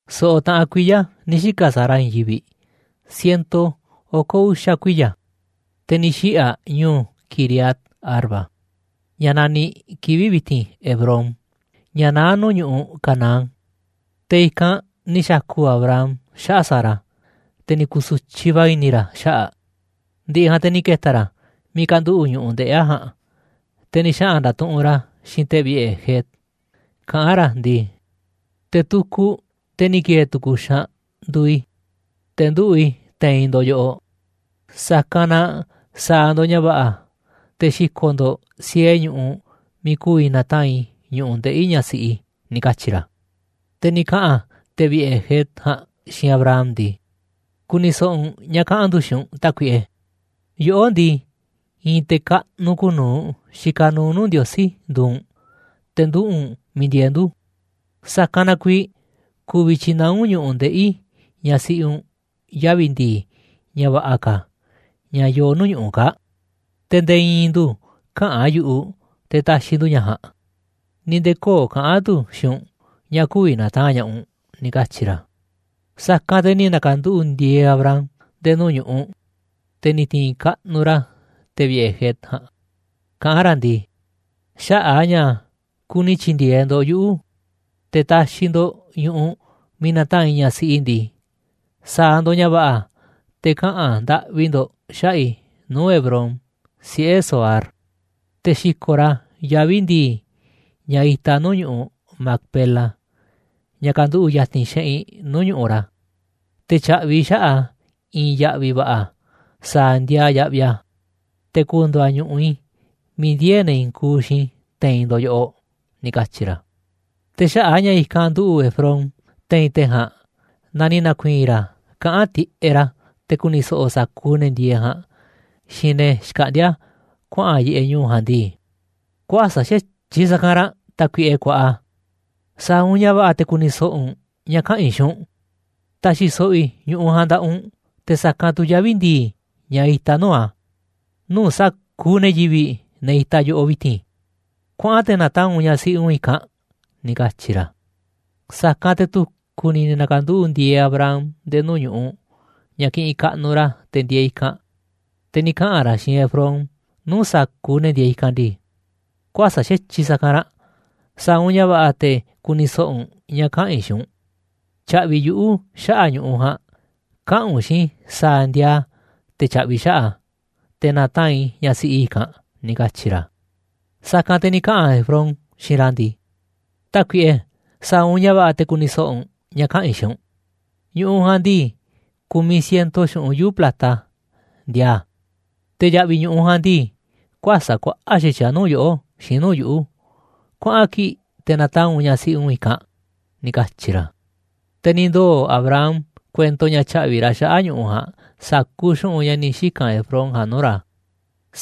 So̱ꞌo̱ taꞌan kuiya̱ ni̱ xika̱ Sara i̱i̱n yivi̱ꞌ, ciento oko̱ uxa̱ kuiya̱, te̱ ni̱ xiꞌi̱ aꞌ ñu̱u̱ Quiriat-arba, ña̱ naniꞌ kivi̱ꞌ vi̱ti̱n Hebrón, ña̱ naá nuu̱ꞌ ñu̱ꞌuꞌ Canaán. Te̱ i̱kanꞌ ni̱ xa̱ku̱ Abraham xaꞌa̱ꞌ Sara, te̱ ni̱ ku̱su̱tyiꞌ va̱ i̱ni̱ ra̱ xaꞌa̱ꞌ aꞌ. Ndi̱ꞌi̱ ja̱a̱nꞌ te̱ ni̱ ke̱ta̱ ra̱ miiꞌ kanduꞌu̱ꞌ ñu̱ꞌuꞌ ndeꞌi̱ aꞌ ja̱a̱nꞌ, te̱ ni̱ xaꞌa̱n nda̱tuꞌunꞌ ra̱ xiinꞌ te̱ vi̱ꞌe̱ Het, kaꞌán ra̱ ndii: ―Te̱ tukuꞌ, te̱ ni̱ ki̱e̱e̱ tu̱ku̱ xaanꞌ, nduuꞌ i̱, te̱ nduꞌu̱ꞌ i̱ te̱i̱n ndo̱ꞌ yoꞌoꞌ, sa̱kanꞌ na sa̱a̱ ndo̱ꞌ ña̱ va̱ꞌa̱ te̱ xi̱ko̱ꞌ ndo̱ꞌ siee ñu̱ꞌuꞌ miiꞌ ku̱vi̱ na̱taa̱nꞌ i̱ ñu̱ꞌuꞌ ndeꞌi̱ ñaꞌ siꞌi i̱ ―ni̱ katyi̱ ra̱. Te̱ ni̱ kaꞌa̱n te̱ vi̱ꞌe̱ Het ja̱a̱nꞌ xiinꞌ Abraham ndii: ―Ku̱ni̱ so̱ꞌo̱ u̱nꞌ ña̱ kaꞌa̱n ndu̱ xiinꞌ u̱nꞌ, tákuiꞌe, yoꞌó ndii, i̱i̱n te̱ kaꞌnuꞌ kuuꞌ nuu̱ꞌ xikaꞌ nuuꞌ nuu̱ꞌ Ndiosí nduuꞌ u̱nꞌ, te̱ nduꞌu̱ꞌ u̱nꞌ miiꞌ ndieeꞌ ndu̱, sa̱kanꞌ na kuiiꞌ ku̱vi̱ tyi̱naá u̱nꞌ ñu̱ꞌuꞌ ndeꞌi̱ ñaꞌ siꞌi u̱nꞌ yavi̱ ndi̱i̱ ña̱ va̱ꞌa̱ ka̱, ña̱ yooꞌ nuu̱ꞌ ñu̱ꞌuꞌ kaa̱ꞌ. Te̱ nde̱e̱ i̱i̱n ndu̱ käꞌa̱n yu̱ꞌuꞌ te̱ ta̱xi̱ ndu̱ ña̱ ja̱a̱nꞌ, ni̱ nde̱e̱ köo̱ꞌ kaꞌa̱n tu̱ xiinꞌ u̱nꞌ ña̱ kü̱vi̱ na̱taa̱nꞌ ña̱ꞌaꞌ u̱nꞌ ―ni̱ katyi̱ ra̱. Sa̱kanꞌ te̱ ni̱ na̱ka̱nduꞌu̱ꞌ ndi̱e̱e̱ Abraham nde̱e̱ nuu̱ꞌ ñu̱ꞌuꞌ, te̱ ni̱ ti̱i̱n kaꞌnuꞌ ra̱ te̱ vi̱ꞌe̱ Het ja̱a̱nꞌ, kaꞌán ra̱ ndii: ―Xaꞌa̱ꞌ a̱ ña̱ kuni tyi̱ndi̱e̱eꞌ ndo̱ꞌ yuꞌu̱ te̱ taxiꞌ ndo̱ꞌ ñu̱ꞌuꞌ miiꞌ na̱taa̱nꞌ i̱ ñaꞌ siꞌi i̱ ndii, sa̱a̱ ndo̱ꞌ ña̱ va̱ꞌa̱ te̱ kaꞌa̱n ndaꞌvi ndo̱ꞌ xaꞌa̱ꞌ i̱ nuu̱ꞌ Efrón, siꞌe̱ Zohar, te̱ xi̱ko̱ꞌ ra̱ yavi̱ ndi̱i̱, ña̱ itaꞌ nuu̱ꞌ ñu̱ꞌuꞌ Macpela, ña̱ kanduꞌu̱ꞌ ya̱ti̱n xeꞌinꞌ nuu̱ꞌ ñu̱ꞌuꞌ ra̱, te̱ tya̱ꞌvi̱ i̱ xaꞌa̱ꞌ a̱ i̱i̱n ya̱ꞌvi̱ va̱ꞌa̱ sa̱a̱ ndiaa yaꞌviꞌ a̱, te̱ ku̱ndu̱u̱ a̱ ñu̱ꞌuꞌ i̱ miiꞌ ndiee̱ ne̱ i̱i̱n kuuꞌ xiinꞌ i̱ te̱i̱n ndo̱ꞌ yoꞌoꞌ ―ni̱ katyi̱ ra̱. Te̱ xaꞌa̱ꞌ a̱ ña̱ i̱kanꞌ nduꞌu̱ꞌ Efrón te̱i̱n te̱ ja̱a̱nꞌ na ni̱ na̱ku̱i̱i̱n ra̱ kaꞌán tiꞌeꞌ ra̱, te̱ ku̱ni̱ so̱ꞌo̱ sa̱kuuꞌ ne̱ ndieeꞌ ja̱a̱nꞌ xiinꞌ ne̱ xkaꞌndíá kuaꞌa̱n yiꞌeꞌ ñu̱u̱ ja̱a̱nꞌ ndii: ―Kuäsa̱ꞌ xa̱tyiꞌ sa̱kanꞌ ranꞌ, tákuiꞌe kuaꞌa, sa̱a̱ u̱nꞌ ña̱ va̱ꞌa̱ te̱ ku̱ni̱ so̱ꞌo̱ u̱nꞌ ña̱ kaꞌa̱n i̱ xiinꞌ u̱nꞌ. Ta̱xi̱ so̱ꞌo̱ i̱ ñu̱ꞌuꞌ ja̱a̱nꞌ nda̱ꞌaꞌ u̱nꞌ te̱ sa̱kanꞌ tu̱ yavi̱ ndi̱i̱ ña̱ itaꞌ nuu̱ꞌ a̱, nuu̱ꞌ sa̱kuuꞌ ne̱ yivi̱ꞌ, ne̱ itaꞌ yoꞌoꞌ vi̱ti̱n, kuaꞌan te̱ na̱taa̱nꞌ u̱nꞌ ñaꞌ siꞌi u̱nꞌ i̱kanꞌ ―ni̱ katyi̱ ra̱. Sa̱kanꞌ te̱ tu̱ku̱ ni̱ ni̱ na̱ka̱nduꞌu̱ꞌ ndieeꞌ Abraham nde̱e̱ nuu̱ꞌ ñu̱ꞌuꞌ ña̱ kiꞌinꞌ kaꞌnuꞌ ra̱ te̱ ndieeꞌ i̱kanꞌ, te̱ ni̱ kaꞌa̱n ra̱ xiinꞌ Efrón nuu̱ꞌ sa̱kuuꞌ ne̱ ndieeꞌ i̱kanꞌ ndii: ―Kuäsa̱ꞌ xa̱tyiꞌ sa̱kanꞌ ranꞌ, sa̱a̱ u̱nꞌ ña̱ va̱ꞌa̱ te̱ ku̱ni̱ so̱ꞌo̱ u̱nꞌ ña̱ kaꞌa̱n i̱ xiinꞌ u̱nꞌ, tya̱ꞌvi̱ yuꞌu̱ xaꞌa̱ꞌ ñu̱ꞌuꞌ ja̱a̱nꞌ, kaꞌa̱n u̱nꞌ xiinꞌ i̱ sa̱a̱ ndiaa a̱ te̱ tya̱ꞌvi̱ i̱ xaꞌa̱ꞌ a̱, te̱ na̱taa̱nꞌ i̱ ñaꞌ siꞌi i̱ i̱kanꞌ ―ni̱ katyi̱ ra̱. Sa̱kanꞌ te̱ ni̱ kaꞌa̱n Efrón xiinꞌ ra̱ ndii: ―Tákuiꞌe, sa̱a̱ u̱nꞌ ña̱ va̱ꞌa̱ te̱ ku̱ni̱ so̱ꞌo̱ u̱nꞌ ña̱ kaꞌa̱n i̱ xiinꞌ u̱nꞌ, ñu̱ꞌuꞌ ja̱a̱nꞌ ndii, ku̱miꞌ ciento xu̱ꞌunꞌ yuu̱ꞌ plata ndiaa a̱, te̱ ya̱ꞌvi̱ ñu̱ꞌuꞌ ja̱a̱nꞌ ndii, kuäsa̱ꞌ kuaꞌa̱ꞌ xa̱tyiꞌ a̱ nuu̱ꞌ yoꞌó xiinꞌ nuu̱ꞌ yuꞌu̱, kuaꞌa̱n kii̱ꞌ te̱ na̱taa̱nꞌ u̱nꞌ ñaꞌ siꞌi u̱nꞌ i̱kanꞌ ―ni̱ katyi̱ ra̱. Te̱ ni̱ ndoo̱ Abraham kuento ña̱ tya̱ꞌvi̱ ra̱ xaꞌa̱ꞌ ñu̱ꞌuꞌ ja̱a̱nꞌ sa̱kuuꞌ xu̱ꞌunꞌ ña̱ ni̱ xika̱n Efrón ja̱a̱nꞌ nuu̱ꞌ ra̱,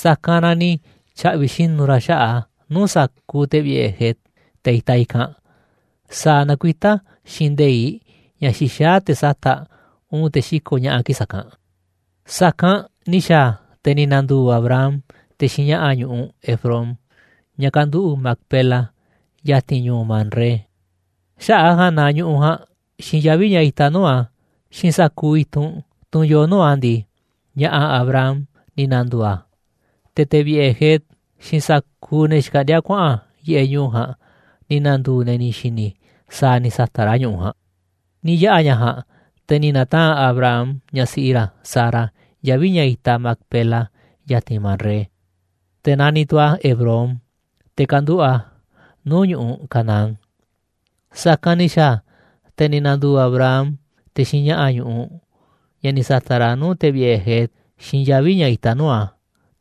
sa̱kanꞌ na ni̱ tya̱ꞌvi̱ xinu̱ ra̱ xaꞌa̱ꞌ a̱ nuu̱ꞌ sa̱kuuꞌ te̱ vi̱ꞌe̱ Het, te̱ itaꞌ i̱kanꞌ, sa̱a̱ nakuitá xiinꞌ nde̱iꞌ ña̱ xixaá te̱ sata̱ꞌ, uun te̱ xiko̱ꞌ ña̱ꞌa̱ kii̱ꞌ sa̱kanꞌ. Sa̱kanꞌ ni̱ xa̱a̱ a̱, te̱ ni̱ na̱ndu̱u̱ Abraham te̱ xiinꞌ ña̱ꞌa̱ ñu̱ꞌuꞌ Efrón, ña̱ kanduꞌu̱ꞌ Macpela ya̱ti̱n ñu̱u̱ Mamré. Xaꞌa̱ꞌ a̱ ja̱a̱nꞌ na ñu̱ꞌuꞌ ja̱a̱nꞌ xiinꞌ yavi̱ ña̱ itaꞌ nuu̱ꞌ a̱, xiinꞌ sa̱kuuꞌ i̱tunꞌ, tunꞌ yoo nuu̱ꞌ a̱ ndii, ña̱ꞌa̱ Abraham ni̱ na̱ndu̱u̱ a̱. Te̱ te̱ vi̱ꞌe̱ Het xiinꞌ sa̱kuuꞌ ne̱ xkaꞌndíá kuaꞌa̱n yiꞌeꞌ ñu̱u̱ ja̱a̱nꞌ ni̱ nduu̱ ne̱ ni̱ xi̱ni̱ sa̱a̱ ni̱ sa̱ta̱ꞌ ra̱ ñu̱ꞌuꞌ ja̱a̱nꞌ. Ni̱ yaꞌa̱ ña̱ ja̱a̱nꞌ, te̱ ni̱ na̱taa̱nꞌ Abraham ñaꞌ siꞌi ra̱ Sara yavi̱ ña̱ itaꞌ Macpela ya̱ti̱n Mamré. Te̱ naniꞌ tu̱ a̱ Hebrón, te̱ kanduꞌu̱ꞌ a̱ nuu̱ꞌ ñu̱ꞌuꞌ Canaán. Sa̱kanꞌ ni̱ xa̱a̱ a̱, te̱ ni̱ na̱ndu̱u̱ Abraham te̱ xiinꞌ ña̱ꞌa̱ ñu̱ꞌuꞌ, ña̱ ni̱ sa̱ta̱ꞌ ra̱ nuu̱ꞌ te̱ vi̱ꞌe̱ Het xiinꞌ yavi̱ ña̱ itaꞌ nuu̱ꞌ a̱,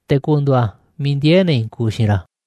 te̱ ku̱ndu̱u̱ a̱ miiꞌ ndiee̱ ne̱ i̱i̱n kuuꞌ xiinꞌ ra̱.